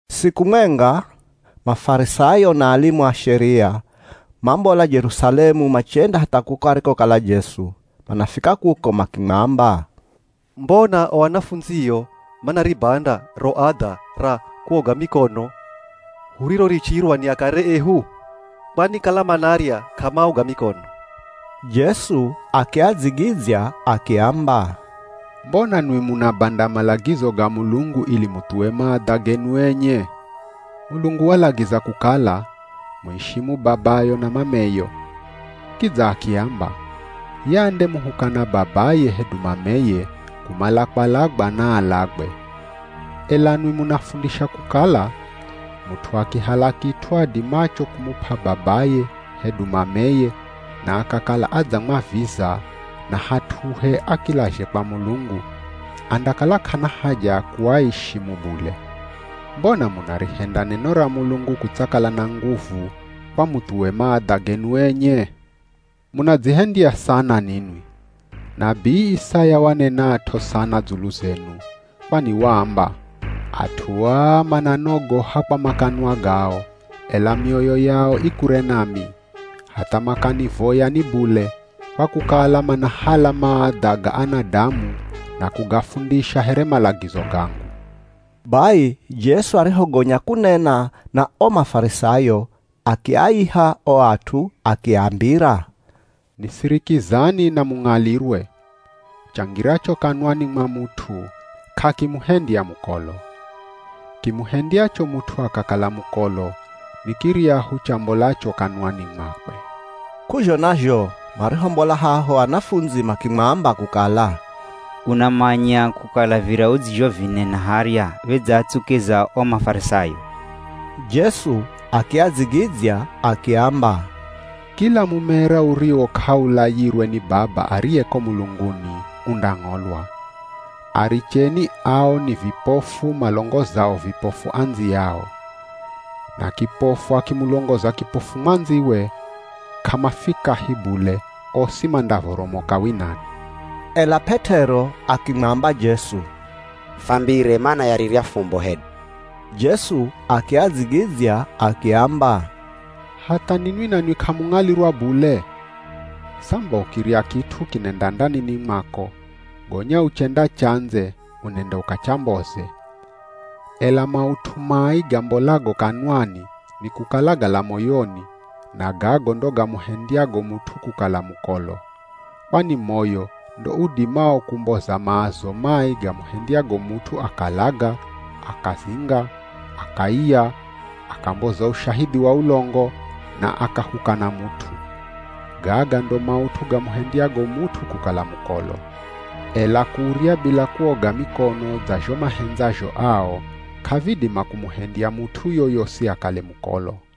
Siku mwenga, Mafarisayo na alimu a Sheria, mambola Jerusalemu machenda hatha kuko arikokala Jesu. Manafika kuko makimwamba, “Mbona o anafundzio manaribanda ro adha ra kuoga mikono hurirorichirwa ni akare ehu? Kwani kala manarya k'amaoga mikono.” Jesu akiadzigidzya akiamba, “Mbona nwi munabanda malagizo ga Mulungu ili muthuwe maadha genu enye? Mulungu walagiza kukala, ‘Muishimu babayo na mameyo.’ Kidza akiamba, ‘Ye andemuhukana babaye hedu mameye, kumala kwalagwa naalagwe.’ Ela nwi munafundisha kukala, mut'u akihala kit'u adimacho kumup'a babaye hedu mameye na akakala adzamwaviza, na hat'uhe akilazhe kwa Mulungu, andakala k'ana haja ya kuaishimu bule. Mbona munarihenda neno ra Mulungu kutsakala na nguvu, kwa muthuwe maadha genu enye? Munadzihendya sana ninwi. Nabii Isaya wanenat'o sana dzulu zenu. Kwani waamba, ‘At'u aa mananogoha kwa makanwa gao, ela mioyo yao i kure nami. Hatha makanivoya ni bule, kwa kukala manahala maadha ga anadamu, na kugafundisha here malagizo gangu.’” Bai Jesu arihogonya kunena na o Mafarisayo, akiaiha o at'u akiambira, “Nisirikizani na mung'alirwe; Changiracho kanwani mwa mut'u, k'akimuhendya mukolo. Kimuhendyacho mut'u akakala mukolo, ni kiryahu chambolacho kanwani mwakwe.” K'uzhona zho marihombola haho, anafundzi makimwamba kukala, “Unamanya kukala virya udzizhovinena harya vidzaatsukiza o Mafarisayo?” Jesu akiadzigidzya akiamba, “Kila mumera uriwo k'aulayirwe ni Baba ariye ko mulunguni, undang'olwa. Aricheni, ao ni vipofu malongozao vipofu andziyao. Na kipofu akimulongoza kipofu mwandziwe, k'amafikahi bule, osi mandavoromoka winani.” Ela P'et'ero akimwamba Jesu, “Fambire mana ya rirya fumbo hedu.” Jesu akiadzigidzya akiamba, “Hatha ninwi nanwi k'amung'alirwa bule? Samba ukirya kit'u kinenda ndanini mwako, gonya uchenda chandze unenda ukachamboze. Ela maut'u mai gambolago kanwani nikukala gala moyoni, na gago ndo gamuhendyago mut'u kukala mukolo. Kwani moyo ndo udimao kumboza maazo mai gamuhendyago mut'u akalaga, akazinga, akaiya, akamboza ushahidhi wa ulongo, na akahukana mut'u. Gaga ndo maut'u gamuhendyago mut'u kukala mukolo. Ela kurya bila kuoga mikono dza zho mahendzazho ao, k'avidima kumuhendya mut'u yoyosi akale mukolo.”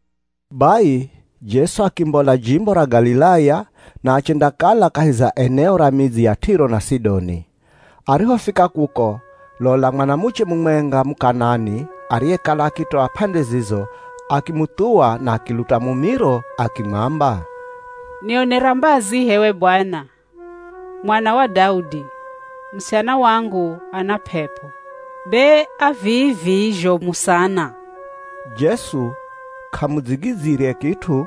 Bai Jesu akimbola jimbo ra Galilaya na achendakala kahi za eneo ra midzi ya Tiro na Sidoni. Arihofika kuko, lola mwanamuche mumwenga Muk'anani ariyekala akitoa p'ande zizo, akimuthuwa na akiluta mumiro akimwamba, “Nionera mbazi h'ewe Bwana, Mwana wa Daudi! Musichana wangu ana p'ep'o, be a vii-vii zhomu sana.” Jesu k'amudzigidzyire kit'u.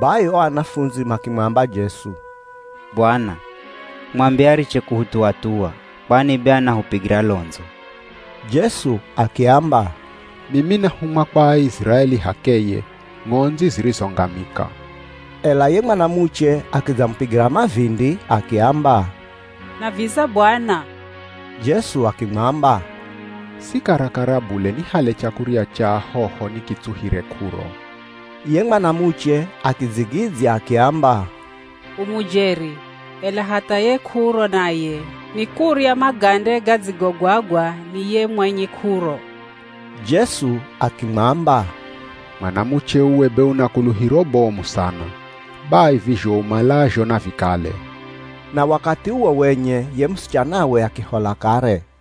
Bai o anafundzi makimwamba Jesu, “Bwana, mwambe ariche kuhuthuwa-thuwa, kwani be anahupigira londzo.” Jesu akiamba, “Mimi nahumwa kwa Aiziraeli h'akeye, ng'ondzi zirizongamika.” Ela ye mwanamuche akidzamupigira mavindi akiamba, “Naviza Bwana.” Jesu akimwamba, “Si karakara bule nihale chakurya cha ahoho nikitsuhire k'uro.” Ye mwanamuche akidzigidzya akiamba, “U mujeri, ela hatha ye k'uro naye nikurya magande gadzigogwagwa ni ye mwenye k'uro.” Jesu akimwamba, “Mwanamuche uwe be una kuluhiro bomu sana. Bai vizho umalazho navikale.” Na wakathi uwo wenye ye musichanawe akihola kare.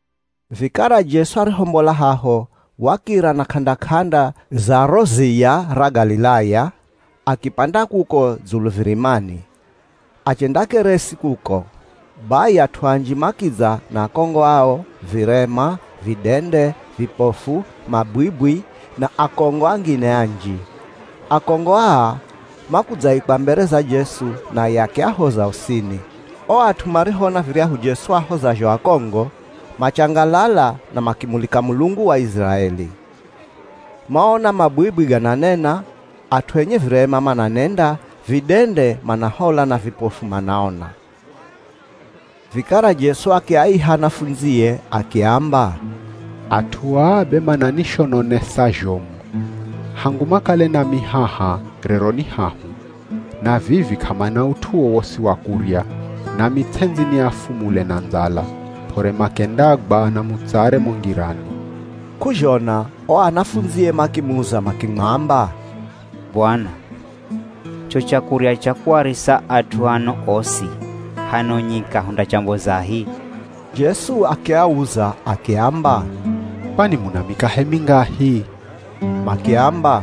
Vikara Jesu arihombola haho, wakira na k'anda-k'anda za ro ziya ra Galilaya, akipanda kuko dzulu virimani, achendakeresi kuko. Bai at'u anji makidza na akongo ao, virema, vidende, vipofu, mabwibwi na akongo angine anji. Akongo aa makudzaikwa mbere za Jesu, naye akiahoza osini. O at'u marihoona viryahu Jesu ahozazho akongo, machangalala na makimulika Mulungu wa Iziraeli. Maona mabwibwi gananena, at'u enye virema mananenda, vidende manahola na vipofu manaona. Vikara Jesu akiaiha anafundzie akiamba, “At'u aa be mananishononesa zhomu. Hangu makale nami haha, rero ni hahu, na vivi k'amana ut'u wowosi wa kurya, nami ts'endzi niafumule na ndzala, p'ore makendagwa na mutsare mo ngirani.” K'uzhona o anafundzie makimuza makimwamba, “Bwana, cho chakurya cha kuarisa at'u ano osi hano nyika hundachambozahi?” Jesu akiauza akiamba, “Kwani muna mikahe mingahi?” Makiamba,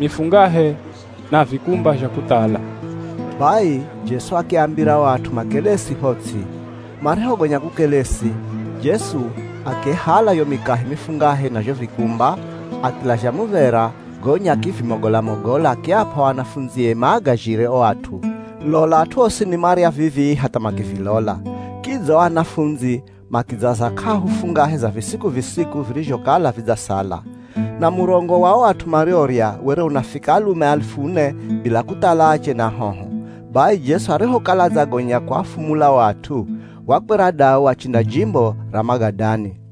“Mifungahe, na vikumba zha kuthala.” Bai Jesu akiambira o at'u makelesi ho ts'i. Marihogonya kukelesi, Jesu akihala yo mikahe mifungahe na zho vikumba, akilazha muv̱era gonya akivimogola-mogola akiap'a o anafundzie maagazhire o at'u. Lola at'u osini marya vivii hatha makivilola, kidza o anafundzi makidzaza k'ahu fungahe za visiku-visiku virizhokala vidzasala. Na murongo wa o at'u mariorya were unafika alume alifu ne, bila kuthala ache na ahoho. Bai Jesu arihokala adzagonya kuafumula o at'u, wakwera dau achenda jimbo ra Magadani.